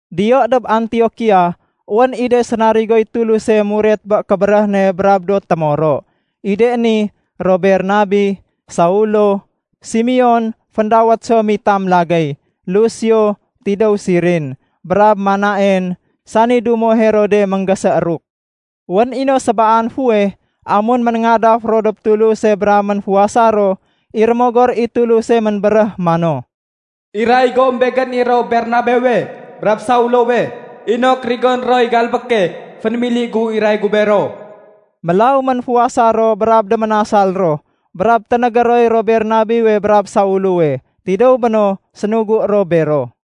Diyo dob Antiokia, wén i de sénarigoy Tuluse muret bé kébéréh ne brab do témoro. I de ni, ro Bernabe, Saulo, Simeon (féndawét so mitam lagéy), Lusio (tidéw Sirin), brab Manaen (sani dumo Herode ménggésééruk). Wén i no sébaan fuweh, amun ménéngadaf ro dob Tuluse brab ménfuwasa ro, i Rémogor i Tuluse ménbéréh mano, “Iray gom Begén i ro Bernabewe brab Saulowe inok rigoné roy galbéke fénémili gu iray gu bero.” Mélaw ménfuwasa ro brab déménasal ro brab ténégé roy ro Bernabewe brab Saulowe. Tidéw béno sénugu ro bero.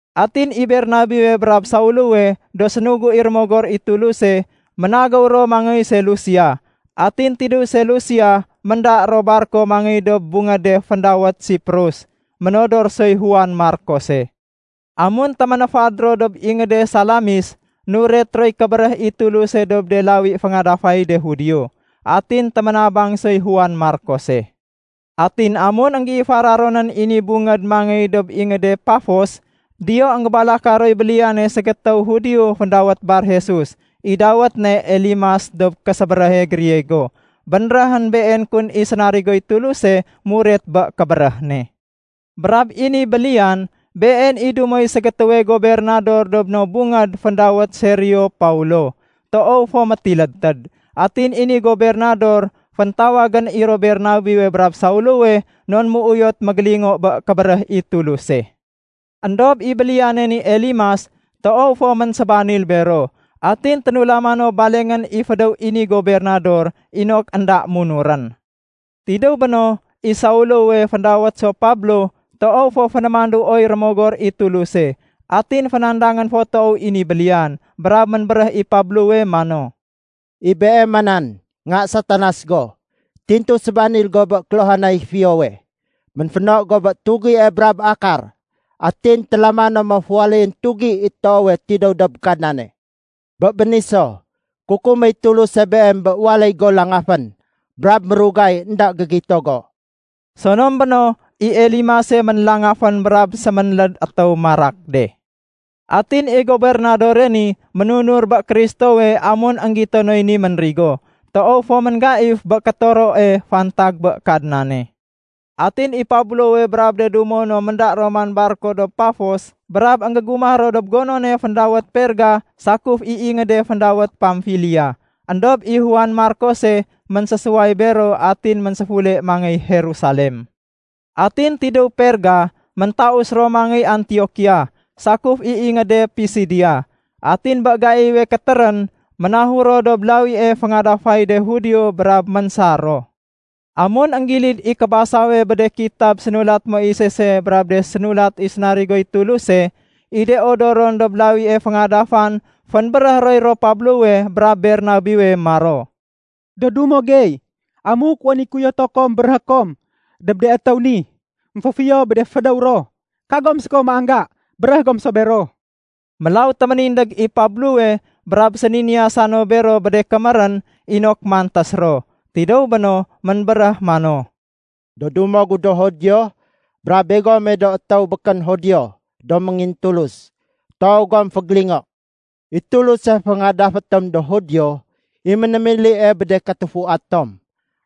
Atin i Bernabewe brab Saulowe do sénugu i Rémogor i Tuluse, ménagéw ro mangéy Selusia, atin tidéw Selusia ménda ro barko mangéy dob bungéde féndawét Siprus. Ménodor soy Juan Markose. Amun téménéfad ro dob ingéde Salamis, nuret roy kébéréh i Tuluse dob de lawi féngadafay de Judio. Atin téménabang soy Juan Markose. Atin amun énggéifara ronén i ni bungéd mangéy dob ingéde Pafos, diyo énggébalaka roy béliyane ségétéw Judio féndawét Bar-Jesus. (I dawét ne Elimas dob késébéréhe Griego.) Bénréhén been kun i sénarigoy Tuluse muret bé kébéréh ne. Brab i ni béliyan, been i dumoy ségétéwe gobernador dob no bungéd féndawét Sergio Paulo, toow fo métilédtéd. Atin i ni gobernador féntawagén i ro Bernabewe brab Saulowe non méuyot mégélingo bé kébéréh i Tuluse. Endob i béliyane ni Elimas, toow fo ménsébanil bero. Atin ténulama no balengén i fédéw i ni gobernador inok énda munurén. Tidéw béno, i Saulowe (féndawét so Pablo) toow fo fénémanduoy Rémogor i Tuluse. Atin fénandangén fo toow i ni béliyan. Brab ménbéréh i Pablowe mano, “I beema nan, nga Satanas go! Tintu sébanil go bé kéluhanay fiyowe. Ménféno go bé tugie brab akar. Atin télamané mo féwaléyén tugi i toowe tidéw dob Kadnane. Bé béni so, kukuméy Tuluse beem bé waléy go langafén brab mérugay énda gégito go.” Sonom béno, i Elimase ménlangafén brab séménléd étéw marak de. Atin i gobernadore ni ménunur bé Kristowe amun énggito noy ni ménrigo. Toow fo ménggaif bé kétoroe fantag bé Kadnane. Atin i Pablowe brab de dumo no ménda ro man barko dob Pafos, brab énggégumah ro dob gonone féndawét Perga sakuf i ingéde féndawét Pamfilia. Endob i Juan Markose ménsésuway bero atin ménséfule mangéy Jerusalem. Atin tidéw Perga, méntaus ro mangéy Antiokia sakuf i ingéde Pisidia. Atin bé gaiwe kétérén, ménahur ro dob lawie féngadafay de Judio brab ménsar ro. Amun énggilid i kébasawe bé de kitab sénulat Moisese brab de sénulat i de sénarigoy Tuluse, i de odoron dob lawie féngadafan fénbéréh roy ro Pablowe brab Bernabewe maro, “Do dumo gey, amuk wén i kéuyoto kom béréhé kom dob de étéw ni émféfiyo bé de fédéw ro, kagom séko méangga, béréh gom so bero.” Mélaw téménindég i Pablowe brab séniniyasa no bero bé de kémérén inok mantés ro. Tidéw béno, ménbéréh mano, “Do dumo gu do Judio, brab begome do étéw békén Judio do méngintulus, toow gom fégélingo. I Tuluse féngadafé tom do Judio, i ménémilie bé de katufua tom.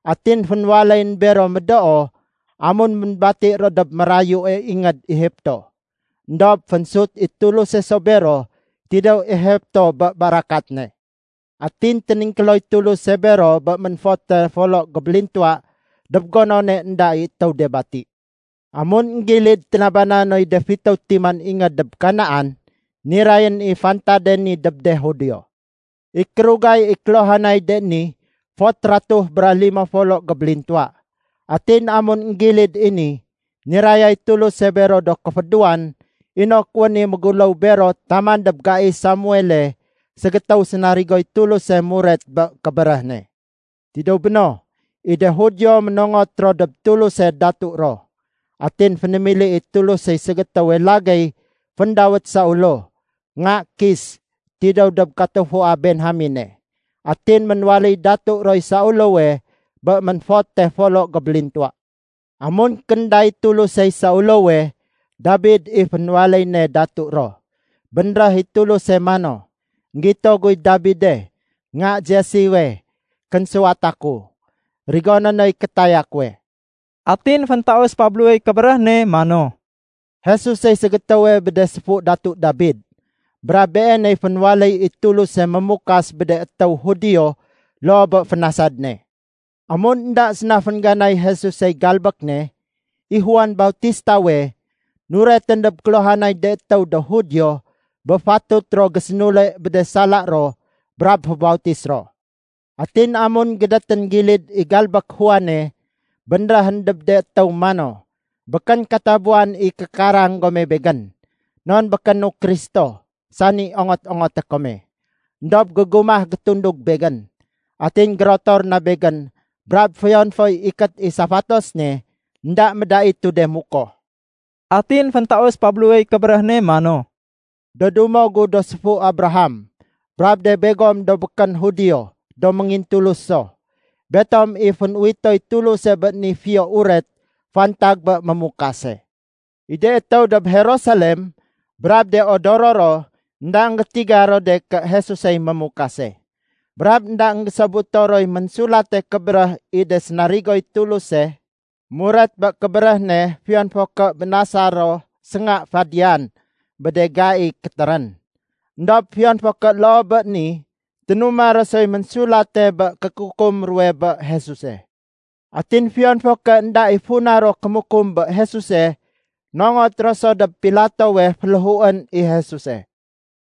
Atin fénwaléyén bero médoo amun ménbati ro dob mérayue ingéd Egipto. Endob fénésut i Tuluse so bero tidéw Egipto bé barakat ne. Atin téningkéloy Tuluse bero bé ménfote folo gébélintuwa dob gonone énda i étéw de bati. Amun énggilid ténaba noy de fitéw timan ingéd dob Kanaan, nirayén i fantade ni dob de Judio. I kérugay i kéluhanay de ni fot ratuh bra limo folo gébélintuwa. “Atin amun énggilid i ni, nirayay Tuluse bero do kéfédéwan inok wén i méguléw bero taman dob gai Samuele, ségétéw sénarigoy Tuluse muret bé kébéréh ne. Tidéw béno, i de Judio ménongot ro dob Tuluse datu ro. Atin fénémili i Tulusey ségétéwe lagéy féndawét Saulo nga Kis tidéw dob katufua Benjamene. Atin ménwaléy datu roy Saulowe bé ménfote folo gébélintuwa. Amun kénday Tulusey Saulowe, Dabid i fénwaléy ne datu ro. Bénréh i Tuluse mano, ‘Enggito guy Dabide, nga Jessewe, kénsuwata ku. Rigoné noy kétaya kuwe.’” Atin féntaus Pablowey kébéréh ne mano, “Jesusey ségétéwe bé de séfu Datu Dabid. Brab Beeney fénwaléy i Tuluse Mémukas bé de étéw Judio loo bé fénasad ne. Amun énda séna féngganay Jesusey galbék ne, i Juan Bautistawe, nuretén dob kéluhanay de étéw do Judio bé fatut ro gésénule bé de sala ro brab fébautis ro. Atin amun gédétén gilid i galbék Juane, bénréhén dob de étéw mano, ‘Békén katabuwan i kékarang gome begén. Non békénu Kristo sani ongot-ongoté kome. Endob gégumah gétundug begén. Atin gérotor na begén brab fiyon foy ikét i safatos ne, énda médaitu de mukoh.’” Atin féntaus Pablowey kébéréh ne mano, “Do dumo gu do séfu Abraham, brab de begom do békén Judio do méngintulus so, betom i fén-uwitoy Tuluse bé ni Fiyo Uret fantag bé Mémukase. I de étéw dob Jerusalem brab de odoro ro énda énggétiga ro de ké Jesusey Mémukase. Brab énda énggésobuto roy ménsulate kébéréh i de sénarigoy Tuluse muret bé kébéréh ne fiyon fo ké bénasa ro sénga fadiyan bé de gai kétérén. Endob fiyon fo ké loo bé ni, ténuma ro soy ménsulate bé kékukum ro bé Jesuse. Atin fiyon fo ké énda i funa ro kémukum bé Jesuse, nongot ro so dob Pilatowe féléhuén i Jesuse.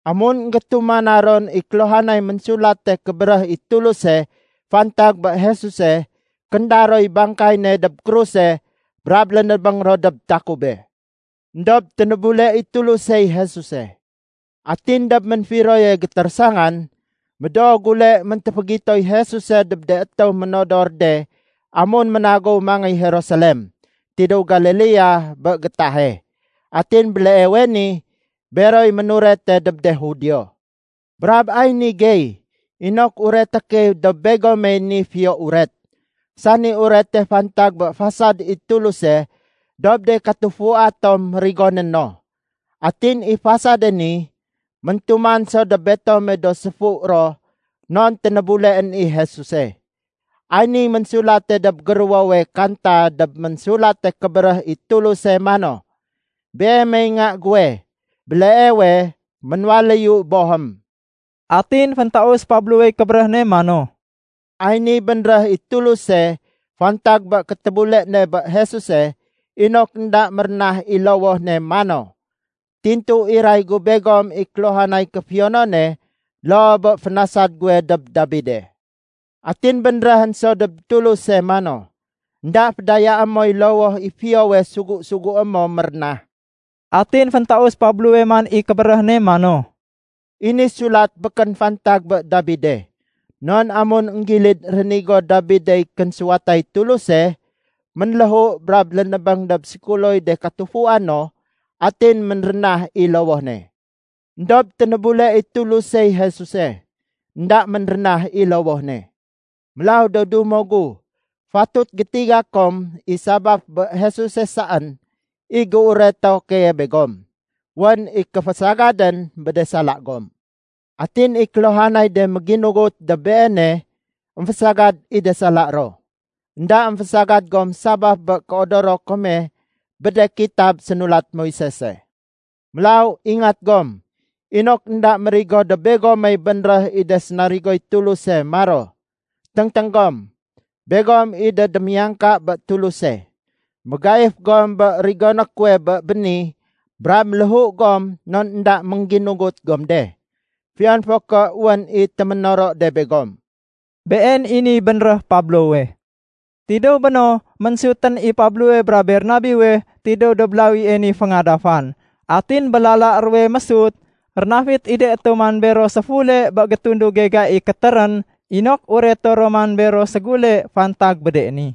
Amun énggétumana ron i kéluhanay Ménsulate Kébéréh i Tuluse fantag bé Jesuse, kénda roy bangkay ne dob kruse brab lénébéng ro dob takube. Endob ténébule i Tulusey Jesuse. Atin dob ménfiroye gétérésangan, médoo gule méntéfégitoy Jesuse dob de étéw ménodor de amun ménagéw mangéy Jerusalem tidéw Galilea bé gétahe. Atin béleewe ni, beroy ménurete dob de Judio. Brab ay ni gey inok ureté key dob begomey ni Fiyo Uret, sani Urete fantag bé fasad i Tuluse dob de katufua tom rigoné no. Atin i fasade ni, méntuman so dob betome do séfu ro non ténébuleén i Jesuse. Ay niy ménsulate dob géruwowe Kanta dob Ménsulate Kébéréh i Tuluse mano, ‘Beemey Nga guwe, béleewe ménwaléyu Bohém.’” Atin féntaus Pablowey kébéréh ne mano, “Ay niy bénréh i Tuluse fantag bé kétébule ne bé Jesuse inok énda mérénah i lowoh ne mano, ‘Tintu iray gu begom i kéluhanay kéfiyonone loo bé fénasad guwe dob Dabide.’ Atin bénréhén so dob Tuluse mano, ‘Enda fédayaé moy lowoh i fiyowe sugu-sugué mo mérénah.’” Atin féntaus Pablowe man i kébéréh ne mano, “I ni sulat békén fantag bé Dabide, non amun énggilid rénigo Dabidey kénsuwatay Tuluse, ménléhu brab lénébéng dob sékuloy de katufua no atin ménrénah i lowoh ne. Endob ténébule i Tulusey Jesuse, énda ménrénah i lowoh ne. Mélaw do dumo gu, fatut gétiga kom i sabaf bé Jesuse saén i géureto keye begom, wén i kéfésagadén bé de sala gom. Atin i kéluhanay de méginugut dob Beene émfésagad i de sala ro. Enda émfésagad gom sabaf bé kéodoro kome bé de kitab sénulat Moisese. Mélaw, ingat gom inok énda mérigo dob begomey bénréh i de sénarigoy Tuluse maro, ‘Téngténg gom, begom i de démiyangka bé Tuluse. Mégaif gom bé rigoné kuwe bé béni brab méléhu gom non énda méngginugut gom de, fiyon fo ké wén i téménoro de begom.’” Been i niy bénréh Pablowe. Tidéw béno, ménsutén i Pablowe brab Bernabewe tidéw dob lawie ni féngadafan. Atin bé lala ruwe mésut, rénafit i de étéw man bero séfule bé gétunduge gai kétérén inok ureto ro man bero ségule fantag bé de ni.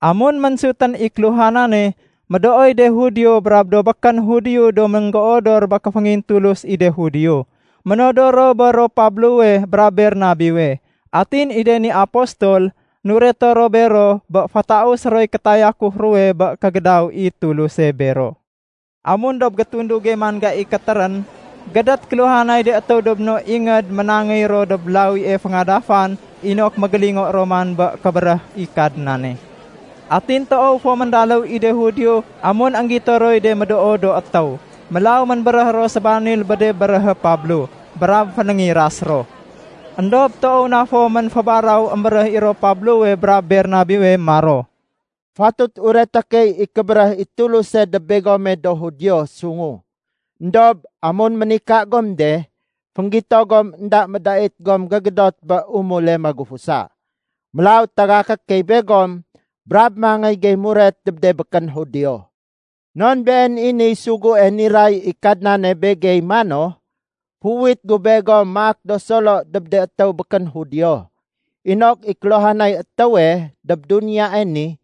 Amun ménsutén i kéluhanane, médooy de Judio brab do békén Judio do ménggéodor bé kéféngintulus i de Judio, ménodor ro bé ro Pablowe brab Bernabewe. Atin i de ni apostol, nureto ro bero bé fétausé roy kétayakuf ruwe bé kégédaw i Tuluse bero. Amun dob gétunduge man gai kétérén, gédét kéluhanay de étéw dob no ingéd ménangéy ro dob lawie féngadafan inok mégélingo ro man bé kébéréh i Kadnane. Atin toow fo méndaléw i de Judio amun énggito roy de médoo do étéw. Mélaw ménbéréh ro sébanil bé de béréhé Pablo, brab fénéngiras ro. Endob toow na fo ménfébaraw émbéréh i ro Pablowe brab Bernabewe maro, “Fatut ureté key i kébéréh i Tuluse dob begome do Judio sungu. Endob amun ménika gom de, fénggito gom énda médait gom gégédot bé umule magufusa. Mélaw tagaké key begom brab mangéy gey muret dob de békén Judio. Non been i niy sugue niray i Kadnane begey mano, ‘Féuwit gu begom maak do solo dob de étéw békén Judio, inok i kéluhanay étéwe dob duniyae ni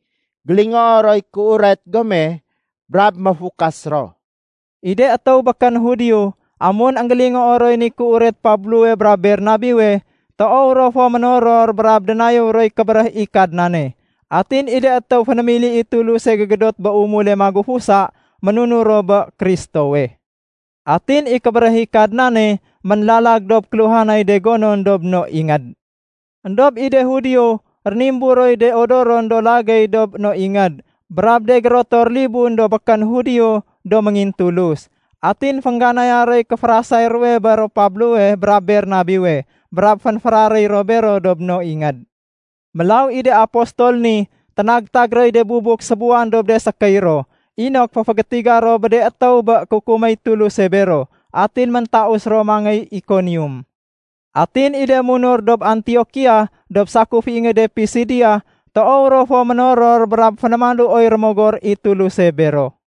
gélingoo roy kéuret gome brab méfukas ro.’” I de étéw békén Judio, amun énggélingoo roy ni kéuret Pablowe brab Bernabewe, toow ro fo ménoror brab dénayéw roy kébéréh i Kadnane. Atin i de étéw fénémili i Tuluse gégédot bé umule magufusa, ménunur ro bé Kristowe. Atin i kébéréh i Kadnane ménlalag dob kéluhanay de gonon dob no ingéd. Endob i de Judio rénimbur roy de odoron do lagéy dob no ingéd brab de gérotor libun do békén Judio do méngintulus. Atin féngganaya roy kéférasay ruwe bé ro Pablowe brab Bernabewe brab fénféraréy ro bero dob no ingéd. Mélaw i de apostol ni, ténagtag roy de bubuk sébuwan dob de sékéy ro inok féfégétiga ro bé de étéw bé kukuméy Tuluse bero. Atin méntaus ro mangéy Ikonium. Atin i de munur dob Antiokia dob sakuf i ingéde Pisidia, toow ro fo ménoror brab fénémanduoy Rémogor i Tuluse bero.